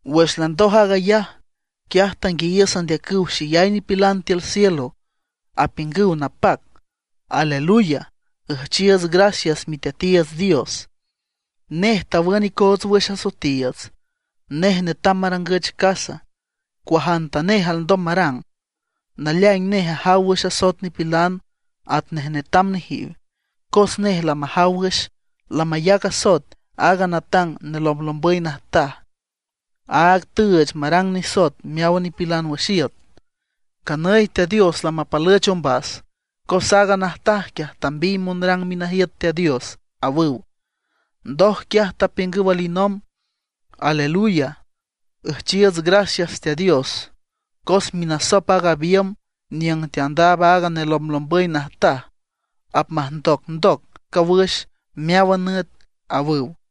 Wüx landoj aag ayaj, quiaj tanguiayiüs andeacüw xeyay nipilan tiül cielo, apiüngüw napac: ¡Aleluya! ¡Üjchiiuts gracias Miteatiiüts Dios! Nej tawün icoots wüx asoetiiüts, nej netam marangüch casa, cuajantanej alndom marang. Naleaing nej ajaw wüx asoet nipilan atnej netam nejiw. Cos nej lamajaw wüx, lamayac asoet aaga natang nelomblombüy najtaj, aaga tüüch marang nisoet meáwan nipilan wüx iüt. Nganüy Teat Dios lamapalüch ombas, cos aaga najtaj quiaj tambiy monrang minajiüt Teat Dios, awüw. Ndoj quiaj tapiüngüw alinomb: ―¡Aleluya! Üjchiiüts gracias Teat Dios, cos minasop aaga biümb niüng teandaab aaga nelomblombüy najtaj apmajndocndoc cawüx meáwan nüt ―awüw.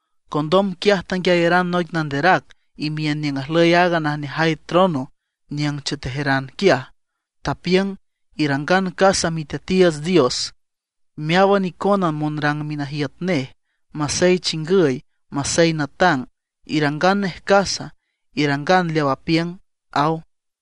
Condom quiaj tanguiayaran noic nanderac imiün niüng ajlüy aaga najneajay trono niüng chetejeran quiaj, tapiüng: Irangan casa Miteatiiüts Dios, meáwan icona monrang minajiüt nej, masey chingüy masey natang, irangan nej casa, irangan leaw apiüng ―aw.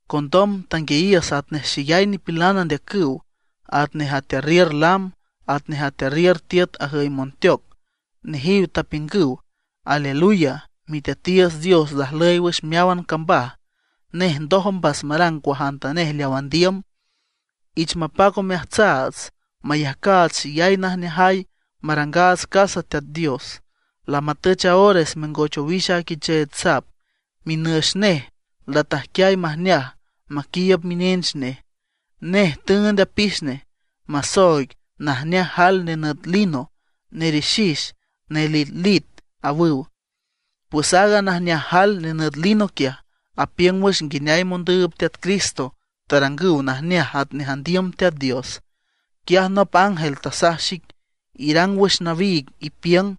Condom tanguiayiüs atnej xeyay nipilan andeacüw, atnej atearriür lam, atnej atearriür tiüt ajüy monteoc. Nejiw tapiüngüw: ¡Aleluya! Miteatiiüts Dios lajlüy wüx meáwan cambaj, nej ndoj ombas marang cuajantanej leaw andiüm. Ich mapac omeajtsaats, mayajcaats xeyay najneajay, marangaats casa Teat Dios; lamatüch a ores mengoch owix a Quicheech Sap. Minüx nej latajquiay majneaj maquiiüb minench nej. Nej tüünd apix nej, masooig najneaj jael nenüt lino, nerixix, nelitlit ―awüw. Pues aaga najneaj jael nenüt lino quiaj, apiüng wüx nguineay mondüüb Teat Cristo tarangüw najneaj atnej andiüm Teat Dios. Quiaj nop ángel tasaj xic: ―Irang wüx nawiig, ipiüng: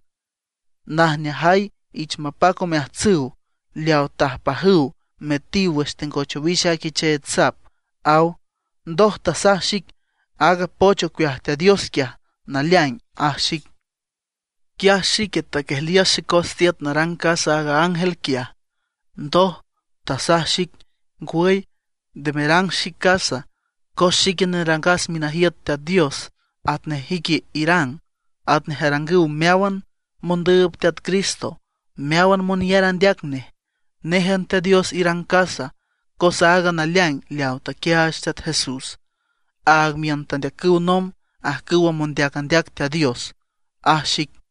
“Najneajay ich mapac omeajtsüw leawa tajpajüw metiw wüx tengoch owix a Quicheech Sap” ―aw. Ndoj tasaj xic: ―Aaga poch ocueaj Teat Dios quiaj, naleaing ―aj xic. Quiaj xique taquiejliüs xecos tiüt narang casa aaga ángel quiaj. Ndoj tasaj xic: ―Ngwüy, nde merang xic casa, cos xique nerangas minajiüt Teat Dios atnej ique irang, atnej arangüw meáwan mondüüb Teat Cristo, meáwan monyar andeac nej. Néjan Teat Dios irang casa. Cos aaga naleaing leawa taquiaach Teat Jesús, áag miün tandeacüw nomb ajcüwa mondeac andeac Teat Dios ―aj xic.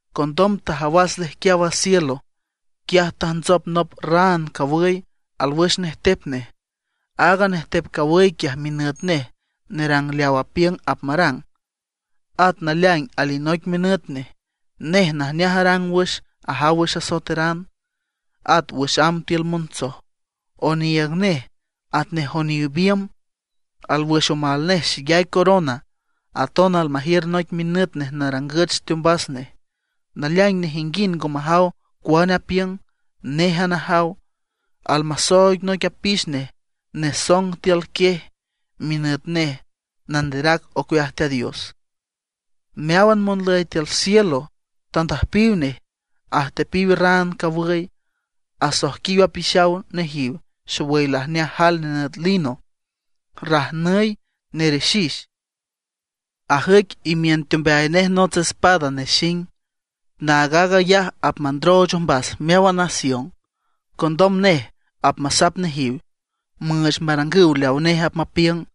Condom tajawas lejquiaw a cielo. Quiaj tajntsop nop raan cawüy alwüx nejtep nej. Aaga nejtep cawüy quiaj minüt nej Nerang Leaw Apiüng Apmarang, at Naleaing alinoic minüt nej. Nej najneaj arang wüx ajaw wüx asoeteran, at wüx amb tiül montsoj. Oniiüg nej atnej oniw biümb; alwüx omal nej xeyay corona. Aton almajiür noic minüt nej narangüch teombas nej; naleaing nejinguind ngo majaw cuane apiüng, néjan ajaw. Almasooig noic apix nej nesong tiül quiej. Minüt nej Nanderac Ocueaj Teat Dios. Meáwan monlüy tiül cielo tandüjpiw nej, ajteptepiw raan cawüy. Asoijquiw apixaw nejiw xowüy lajneaj jael nenüt lino, rajnüy, nerixix. Ajüic imiün teombeay nej nots espada nexing. Naag aag ayaj apmandrooch ombas meáwan nación. Condom nej apmasap nejiw, müüch marangüw leawa nej apmapiüng.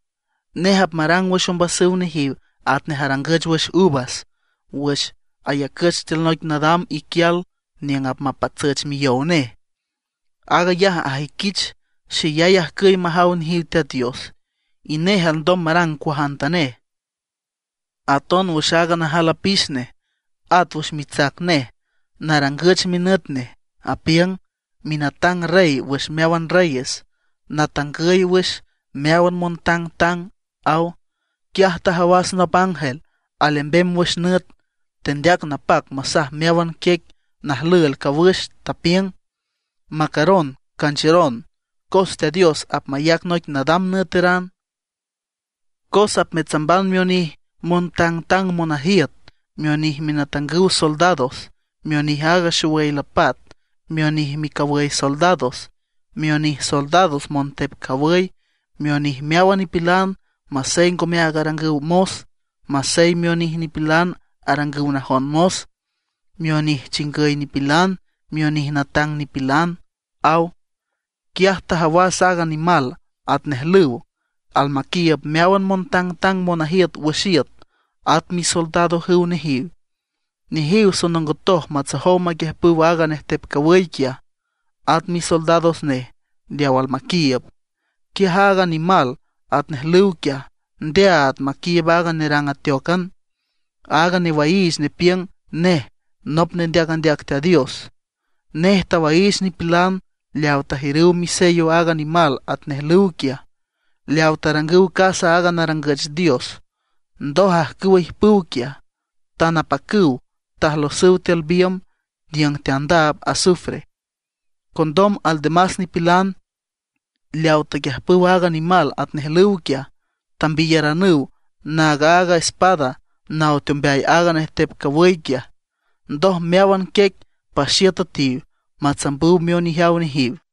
Nej apmarang wüx ombasüw nejiw atnej arangüch wüx uvas wüx ayacüch tiül noic nadam iquial niüng apmapatsüch miyow nej. Aag ayaj ajüiquich xeyay ajcüy majaw nejiw Teat Dios, y nej alndom marang cuajantanej. Aton wüx aaga najal apix nej, at wüx mitsac nej narangüch minüt nej, apiüng: “Minatang Rey wüx meáwan Reyes, Natangüy wüx meáwan montangtang”, aw. Quiaj tajawas nop ángel alembem wüx nüt, tendeac napac masaj meáwan quiec najlüel cawüx, tapiüng: ―Macaron, canchiüron, cos Teat Dios apmayac noic nadam nüeteran. Cos apmetsamban mionij montangtang monajiüt, mionij minatangüw soldados, mionij aag xowüy lapat, mionij micawüy soldados, mionij soldados montep cawüy, mionij meáwan nipilan masey ngomeaag arangüw mos, masey mionij nipilan arangüw najon mos, mionij chingüy nipilan, mionij natang nipilan ―aw. Quiaj tajawas aaga nimal atnej lüw almaquiiüb meáwan montangtang monajiüt wüx iüt at misoldadojüw nejiw. Nejiw sonongotoj matsojow maquiüjpüw aaga nejtep cawüy quiaj, at misoldados nej leawa almaquiiüb. Quiaj aaga nimal atnej lüw quiaj, ndeaad maquiiüb aaga nerang ateócan, aaga newaiich nepiüng nej nop nendeac andeac Teat Dios. Nej tawaiich nipilan leawa tajiürüw misello aaga nimal atnej lüw quiaj, leaw tarangüw casa aaga narangüch dios. Ndoj ajcüwa ijpüw quiaj, tan apacüw tajlosüw tiül biümb niüng teandaab azufre. Condom aldemas nipilan leaw taquiüjpüw aaga nimal atnej lüw quiaj tambiyaranüw naag aaga espada naw teombeay aaga nejtep cawüy quiaj. Ndoj meáwan quiec paxiüt üetiw matsambüw mionijeaw nejiw.